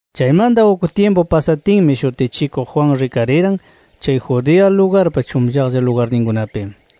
Chaymanta uk tyimpu pasatinmi Shutichikuq Juan rikariran chay Judea lugarpa chunllaqlla lugarninkunapi.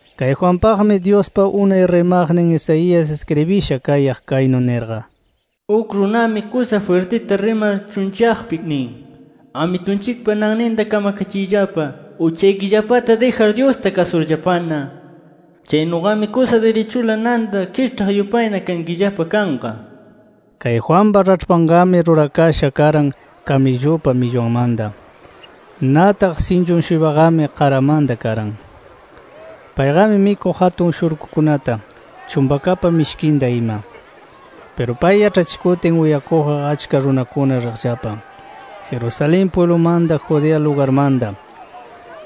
Kay Juanpaqmi Dyuspa unay rimaqnin Isaías iskribisha kayaq kaynu nirqa: “Uk runami kusa jwirtita rimar chunllaqpi nin: ‘Amitunchikpa nanninta kamakachiyllapa uchaykillapata dijar, Dyusta kasurllapana. Chaynuqami kusa dirichula nanta kiĉhaq yupayna kankillapa kanqa’ nir”. Kay Juanpa raĉhpanqami rurakasha karan kamillupa millwanmanta. Nataq sinchun-shuypaqami qaramanta karan. Payqami mikuq atun shurkukunata, chumpakapa mishkinta ima. Piru pay yaĉhachikutin uyakuqqa achka runakuna riqllapa Jerusalén pwiblumanta, Judea lugarmanta,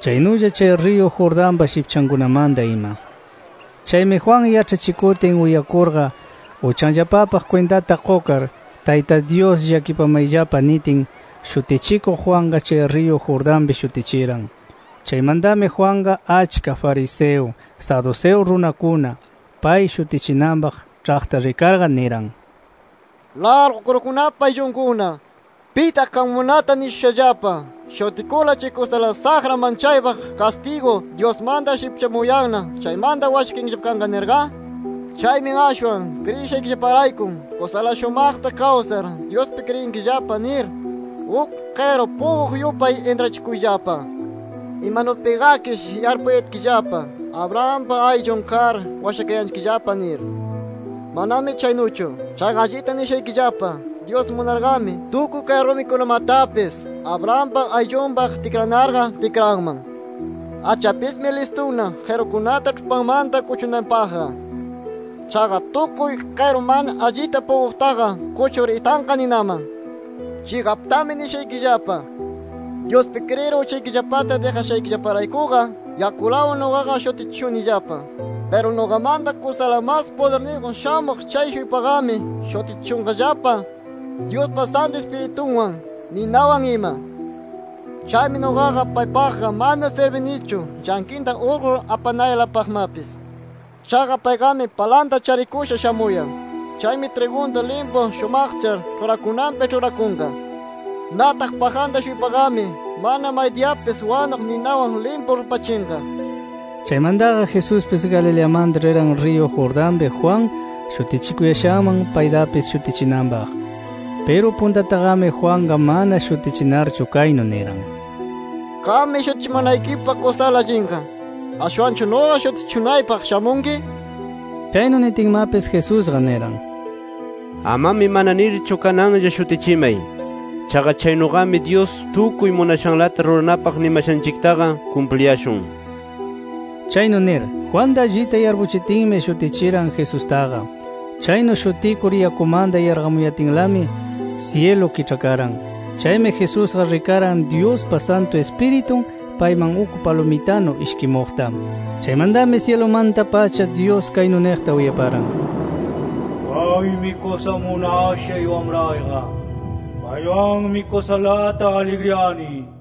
chaynulla chay riyu Jordanpa shipchankunamanta ima. Chaymi Juan yaĉhachikutin uyakurqa uchanllapapaq kwintata qukar, Tayta Dyus llakipamayllapa nitin, Shutichikuq Juanqa chay riyu Jordanpi shutichiran. Chaymantami Juanqa, achka fariseo, saduceo runakuna, pay shutichinanpaq ĉhaqta rikarqa niran: “¡Largu kurukunapa ayllunkuna! ¿Pitaq qamkunata nishushallapa: ‘Shutikurla chay kusala saqra manchaypaq kastigu Dyusmanta shipchamuyanna chaymanta washakayankillapa kanqa’ nirqa? Chaymi ashwan kriyishaykillaparayku kusala shumaqta kawsar Dyuspi kriyinkillapa nir uk qiru puquq yupay intrachikuyllapa. Imanupiqakish yarpuyatkillapa, Abrahampa ayllun kar washakayanchikllapa nir. ¡Manami chaynuchu! Chaqa allita nishaykillapa: Dyus munarqami, tukuy kay rumikunamatapis Abrahampa ayllunpaq tikranarqa tikranman. Achapismi listuna qirukunata ĉhupanmanta kuchunanpaqqa. Chaqa tukuy qiru mana allita puquqtaqa kuchur itanqa ninaman. “Chiqaptami nishaykillapa: Dyuspi kriyir uchaykillapata dijashaykillaparaykuqa yakulawan nuqaqa shutichishunillapa. Piru nuqamanta kusala mas pudirniyjun shamuq chay-shuypaqami shutichishunqallapa Dyuspa Santu Ispiritunwan, ninawan ima. Chaymi nuqaqa paypaqqa mana sirbinichu llanqinta urqur apanaylapaqmapis. Chaqa payqami palanta charikusha shamuyan. Chaymi trigunta limpu shumaqchar ĉhurakunanpi ĉhurakunqa. Nataq pajanta-shuypaqami mana maydiyapis wanuq ninawan limpu rupachinqa”. Chaymantaqa Jesuspis Galileamanta riran riyu Jordanpi Juan shutichikuyashanman paytapis shutichinanpaq. Piru puntataqami Juanqa mana shutichinarchu kaynu niran: —Qammi shutichimanaykipaq kusala allinqa. ¿Ashwanchu nuqa shutichishunaypaq shamunki? nir. Chaynu nitinmapis Jesusqa niran: —Amami mana nirchu kananlla shutichimay. Chaqa chaynuqami Dyus tukuy munashanlata ruranapaq nimashanchiktaqa kumpliyashun nir. Chaynu nir, Juanta allinta yarpuchitinmi, shutichiran Jesustaqa. Chaynu shutikur yakumanta yarqamuyatinlami syilu kiĉhakaran. Chaymi Jesusqa rikaran Dyuspa Santu Ispiritun payman uk palumitanu ishkimuqta. Chaymantami syilumanta-pacha, Dyus kaynu niqta uyaparan. “Kaymi kusa munashay Wamrayqa. Paywanmi kusalata aligriyani” nir.